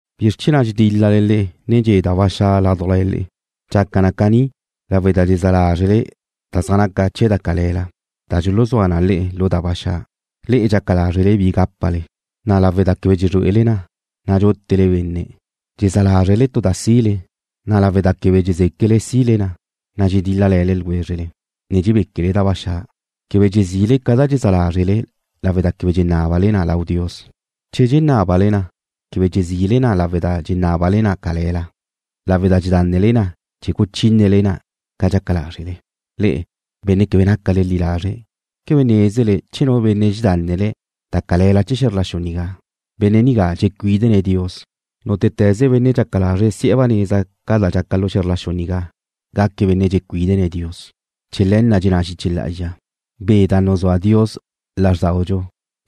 ¿Bizr chee̱ na' dxedíl-lale ne dxe' da ba xa' ládujla le'e? Dxaca caní lawe' da dxezá lázrele da zaj naca chee̱ da cale̱la, da dxuluzúa na le'e lu da ba xa'. Le'e dxaca lázrele bi gápale, na' lawe' da quebe dxezrué'ele na, na' dxútele benne'. Dxezá lázrele tu da sile, na' lawe' da quebe dxezéquele sile na, na' dxedíl-lale̱ ljwézrele, ne dxebéquele da ba xa'. Quebe dxezile ca da dxezá lázrele lawe' da quebe dxenábale na lau Dios. Che dxenábale na, quebe dxezile na lawe' da dxenábale na cale̱la, lawe' da dxedánele na chee̱ guchínele na ca da dxaca lázrele. Le'e, benne' quebe nácale li lazre', ¿quebe nézele che nu benne' dxedánnene̱' da cale̱la da de̱ lu xe̱zr la xu nigá, benne' nigá dxecuídene̱' Dios? Nútete̱ze benne' dxaca lazre̱' si'e̱ ba neza ca da dxaca lu xe̱zr la xu nigá naque̱' benne' dxecuídene̱' Dios. Chee̱ le̱ na' dxenná xiche lá'azxa: Be' da nuzúa Dios lázrdaudxu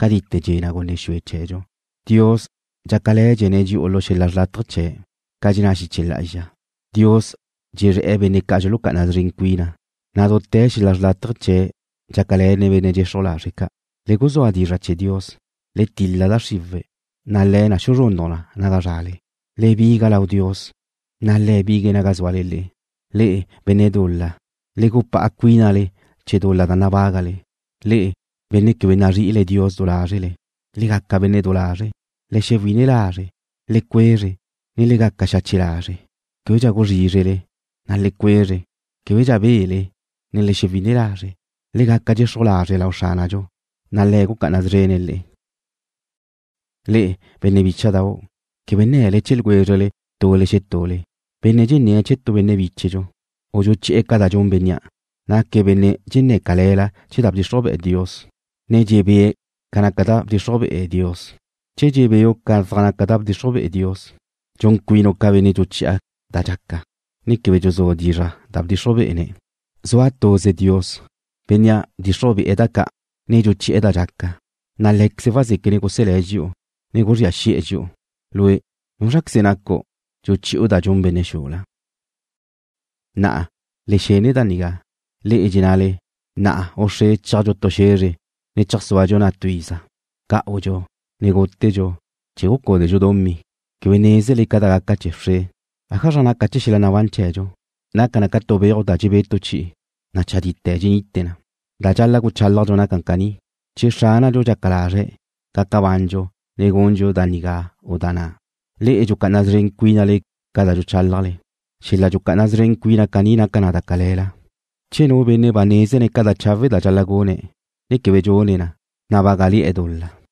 cadite dxe'e̱ gunne xue chee̱dxu. Dios dxácale̱dxene̱' dxi'u lu xel-la' xrlátaje chee̱', ca dxenná xiche lá'azxa: Dios dxezré̱'e̱ benne' ca' dxulucá'ana szren cuina, na' dute̱ xel-la' xrlátaje chee̱' dxácale̱ne̱' benne' dxexruj lazre' ca'. Le guzúa dizra' chee̱ Dios. Le til-la da xriwe̱', na' le̱ na xuzrunnuj na naga zrale. Le biga lau Dios, na' Le̱' bigue̱' naga zúale le'e. Le'e, benne' dul-la, le gupá'a cuínale chee̱ dul-la da nabágale. Le'e, benne' quebe nazri'ile Dios du lázrele, le gaca benne' du lazre'. Le guzua ba xa' lázre'le. Le cuezre, ne le gaca xache' lazre'. Québedxa guzrízrele, na' le cuezre. Québedxa bele, ne le xewine lazre'. Le gaca dxexruj lazre' lau Xránadxu, na' Le̱' gucá'ana szrene̱' le'e. Le'e, benne' bícha'dau', quebe nne̱le chee̱ ljwézrele tule xetule. Benne' dxenné̱' chee̱ tu benne' bíchedxu, u dxuchi'e̱ ca da dxun bénnea', naque̱' benne' dxenné̱' cale̱la chee̱ da bdxixruj be'e Dios, ne dxebée̱' ca zaj naca da bdxixruj be'e Dios. Che dxebéu' ca zaj naca da bdxixruj be'e Dios, dxun cuinu' ca benne' dxuchi'e̱ da dxaca, ne quebe dxuzú' dizra' da bdxixruj be'e̱. Zua tuze Dios, Bénnea' bdxixruj be'e̱ da ca', ne dxuchi'e̱ da dxaca, na' Lé̱queze̱' wazéquene̱' guselé̱' dxi'u, ne guzría xi'e̱ dxi'u. Lue', ¿núzraqueze nacu', dxuchi'u da dxun benne' xula? Na'a, le xene da nigá, le'e dxennale: Na'a u wxre chéajdxu tu xe̱zre ne cheajsúadxu na' tu iza. Gá'udxu, ne gútedxu chee̱ gucúdedxu dumí. Quebe nézele ca da gaca wxre. ¿Ájazra naca chee̱ xel-la' nabán chee̱dxu? Naca na ca tu beuj da dxebé' tu chi'i, na' chadí dxenite na. Da dxal-la' guchálajle naca caní: Che Xránadxu dxaca lazre̱', gaca bandxu ne gundxu da nigá u da na'. Le'e dxucá'ana szren cuínale ca da dxuchálajle. Xel-la' dxucá'ana szren cuina caní naca na da cale̱la. Che nu benne' ba nézene̱' ca da chawe' da dxal-la' gune̱', na' quebe dxune̱' na, na' bágale̱'e̱ dul-la.